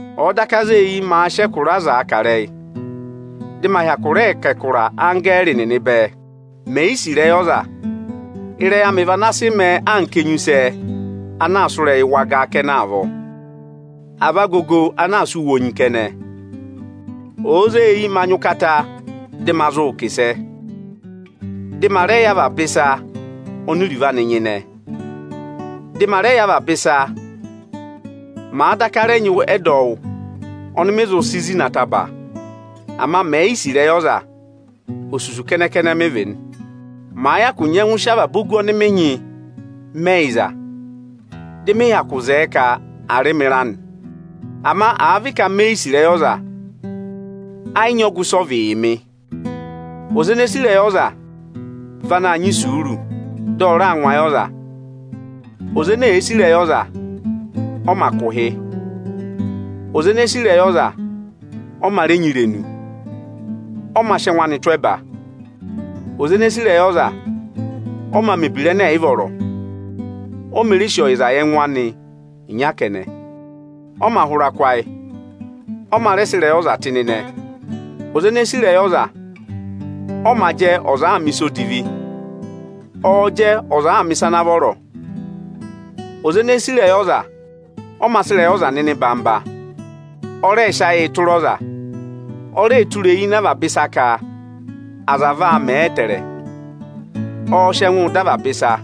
Ọ̀ọ daka zee eyi maa sị ẹkụra azaa kà ịrẹyị, dị ma hyakụ rẹẹ kà ẹkụra anggẹẹrị nịnị bẹẹ, mè yi sì ịrẹyị ọza, ịrẹyị amị vị ana sị mẹẹ anka enyusẹ ana aa sụ́ ịrẹyị wagaa kẹnẹ avọọ, à vị agogo ana aa sụ́ wonyii kẹnẹ. Òo zee eyi ma nyị ụkata dị ma zụụ kà ịsẹ, dị ma rẹ yẹ avaba ịsa oni iruvo anị nyịnẹ, ọnịrị avaba ịsa ana vọ, màa daka rẹ nyị ẹdọwụ ọnị mị zụ si zina ataba, ama mè yi sì ịrẹyị ọza, osusu kẹnẹ-kẹnẹ mị vị nị. Màa hyakụ nyẹngụ sị avaba ogu ọnị mị nyị mẹ ẹyịza, dị mị hyakụ zẹẹ ka à rị mị ịra nị, ama àa vị ka me yi sì ịrẹyị ọza, ẹ yị nyị ọgụ ịsị ọ vị yị mị. Ọza ene sì ịrẹyị ọza vị anaā nyị isuuru, dị ọ raa ngụ ayị ọza. Ọza ene sì ịrẹyị ọza, ọ mā kụ̀ ụhị. Ọza ene sì ịrẹyị ọza, ọ mā rẹ nyị irenu, ọ mā sị ẹngụ anị tụ́ ẹba. Ọza ene sì ịrẹyị ọza, ọ mā mẹ̀ ebira ẹnẹ ẹ̀ yị vọrọ, o mē re sì ọyịza yị ẹngụ anị ịnya kẹnẹ, ọ mā hụra kụ́ ayị, ọ mā rẹ sị ịrẹyị ọza tụ́ ịnị ịnẹ. Ọza ene sì ịrẹyị ọza, ọ mā jẹ, ọza àaa mẹ̀ ịsa odivi. Ọọ̄ jẹ, ọza àaa mẹ̀ ịsa ana vọrọ. Ọza ene sì ịrẹyị ọza, ọ mā sị ịrẹyị ọza nọ ịnị orere. Ọ rẹẹ̄ sị ayịị tụra ọza, o reē tụra eyi ịnị avaba ịsa ka aza vaa mẹ ẹtẹẹrẹ. Ọọ̄ sị ẹngụụ dọ avaba ịsa.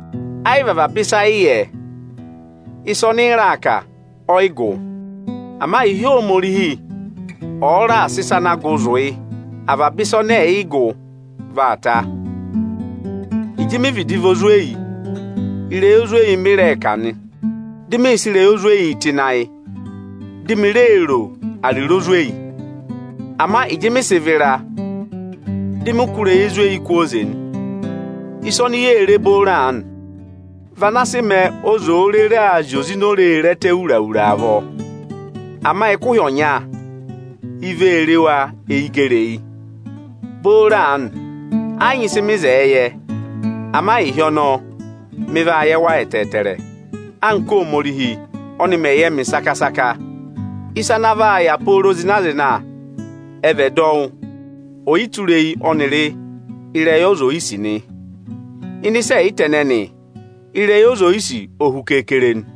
Ẹ yị vị avaba ịsa ị yẹ; ịsẹ ọnị ị raa kà, ọ yị gụ. Ama ịhị Ohomorihi ọ raà sị ịsa ana gụ zụ yị, avaba ịsa ẹnẹ ẹ̀ yị gụ vaa ta. Ịjị mị vịdị vị ozweyi, ịrẹyị ozweyi mịị̄ rẹẹ kà nị, dị mị sị ịrẹyị ozweyi tụ́ ịnị ayị, di mi reē ro ariro ozweyi nị. Ama ịjị mị sị vịra, dị mị kụ́ ịrẹyị ezweyi kwooze nị. Ịsa oni yee re booro aanị, vị ana sị mẹẹ ọza òo rere aa zị oze ini ore re ẹtẹ wura-wura avọọ. Ama ẹkụhị ọnya, i vee re wa eyi gẹrị eyi. Booro aanị, ẹ yị nyị ịsị mị zẹẹ yẹ; ama ịhị ọnọọ, mị vaa yẹ wa ẹtẹẹtẹrẹ, anka Óhomorihi ọnị mẹ̀ yẹ mị saka-saka. Ịsa ana vaa yà pooro zịna-zịna ẹ vị ẹdọwụ, ọyịtureyi ọnịrị ịrẹyị ọza oyisì nị. Ịnị ịsa ẹyịta ẹnẹnị, ịrẹyị ọza oyisì o hu keekere nị.